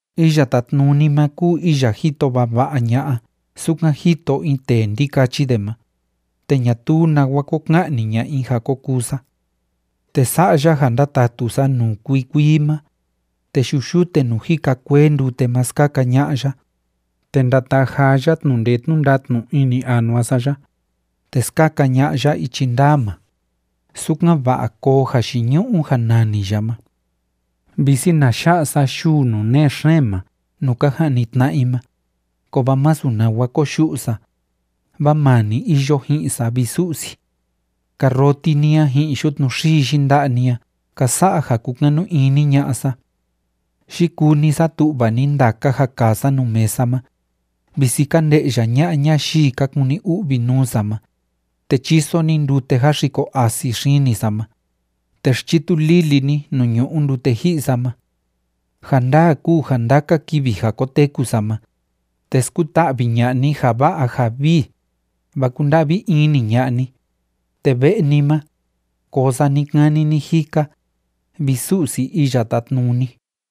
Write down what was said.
Iya Tátnuni ma kúu iya jito vava'a ña'a sukan jito in tee ndikachi de ma, te ñatuu nawa ko ka'ni ña'a i ja ko kuu sa. Te sa'a ya ja ndatatu sa nuu kuii kuii ma, te yu'u yute nuu jika kuee ndute ma skaka ña'a ya, te ndataa jaa ya tnu'u ndee tnu'u ndatnu ini anua sa ya, te skaka ña'a ya ichi ndaa ma, sukan‑va'a koo jayiñu'u ja nani ya ma. Visi na ya'a sa yuu nuu nee xeen ma nuu ka ja'ni tna'a i ma, kovaa masu nawa koyu'u sa, vaa maa ni iyo ji'in sa, vi Su'si. Karroti ni a ji'in yutnu xii yinda'a ni a ka sa'a ja kúkanu ini ña'a sa. Yikuu ni satu'va ni ndaka ja kaa sa nuu mesa ma, visi ka nde'ya ña'a ñayii ka kuni u'vi nuu sa ma, te chíso ni ndute jáxiko asi xini sa ma, te xchitu lili ni nuu ñu'u ndute ji'i sa ma. Ja ndaa kúu ja ndaka kivi ja koteku sa ma, te skuta'vi ña'a ni ja va'a ja vii, vaa kúnda'vi ini ña'a ni, te ve'e ni ma, koo sa ni‑kani ni‑jika, vi Su'si Iya Tátnuni.